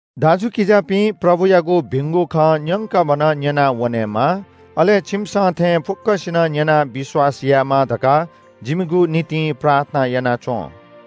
दाजुकिजापिं, प्रभुयागु भिंगु खँ न्‍यंकभनं न्‍यनावनेमा, अले छिमिसं थें फुक्‍कसिनं न्‍यनाः विश्‍वास यायेमा धकाः जिमिगु निंतिं प्रार्थना याना च्‍वँ।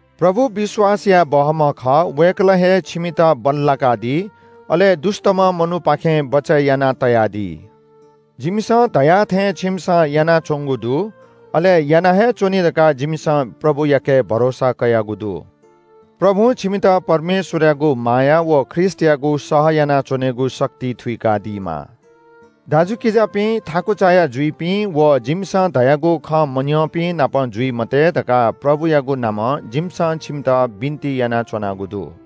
प्रभु विश्‍वास याये बहःम्‍ह खः। वय्‌कलं हे छिमित बल्‍लाकादी, अले दुष्‍टम्‍ह मनूपाखें बचय् यानातयादी। जिमिसं धया थें छिमिसं यानाच्‍वंगु दु, अले याना हे च्‍वनी धकाः जिमिसं प्रभुयाके भरोसा कयागु दु। प्रभुं छिमित परमेश्‍वरयागु माया व ख्रीष्‍टयागु सह यानाच्‍वनेगु शक्ति थुइकादीमा। दाजुकिजापिं, थाकु चायाः जुइपिं व जिमिसं धयागु खँ मन्‍यंपिं नाप जुइ मते धकाः प्रभुयागु नामं जिमिसं छिमित बिन्‍ति यानाच्‍वनागु दु।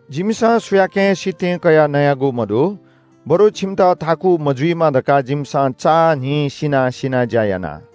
जिमिसं सुयाकें सितिं कयाः नयागु मदु, बरु छिमित थाकु मजुइमा धकाः जिमिसं चां न्‍हिं सिनाः सिनाः ज्‍या याना।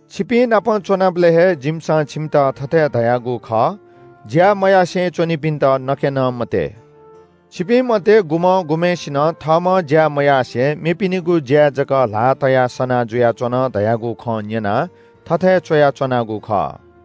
छिपिंनाप च्‍वनाबलय् हे जिमिसं छिमित थथे धयागु खः – “ज्‍या मयासें च्‍वनीपिन्‍त नके नं मते।” छिपिं मध्‍ये गुम्‍हं गुम्‍हय्‌सिनं थःम्‍हं ज्‍या मयासें मेपिनिगु ज्‍याय् जक ल्‍हाः तयाः सना जुयाच्‍वन धयागु खँ न्‍यनाः थथे च्‍वयाच्‍वनागु खः।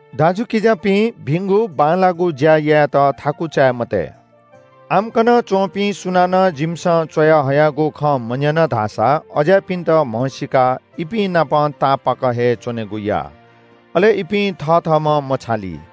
दाजुकिजापिं, भिंगु बांलाःगु ज्‍या यायेत थाकु चाये मते। आम्‍कन च्‍वंपिं सुनानं जिमिसं च्‍वयाहयागु खँ मन्‍यन धाःसा अज्‍याःपिन्‍त म्‍हसीकाः इपिं नाप तापाक हे च्‍वनेगु या। अले इपिं थथःम्‍हं मछाली।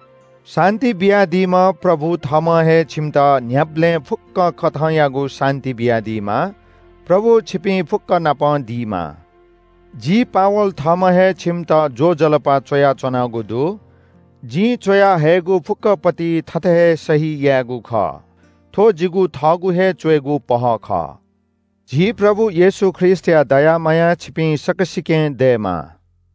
शान्‍ति बियादीम्‍ह प्रभु थःम्‍हं हे छिमित न्‍ह्याबलें फुक्‍क कथंयागु शान्‍ति बियादीमा। प्रभु छिपिं फुक्‍क नाप दीमा। जि पावल थःम्‍हं हे छिमित ज्‍वजलपा च्‍वयाच्‍वनागु दु। जिं च्‍वया हयेगु फुक्‍क पौलय्‌ थथे हे सही यायेगु खः। थ्‍व जिगु थःगु हे च्‍वयेगु पहः खः। झी प्रभु येशू ख्रीष्‍टया दया माया छिपिं सकसिकें दयेमा।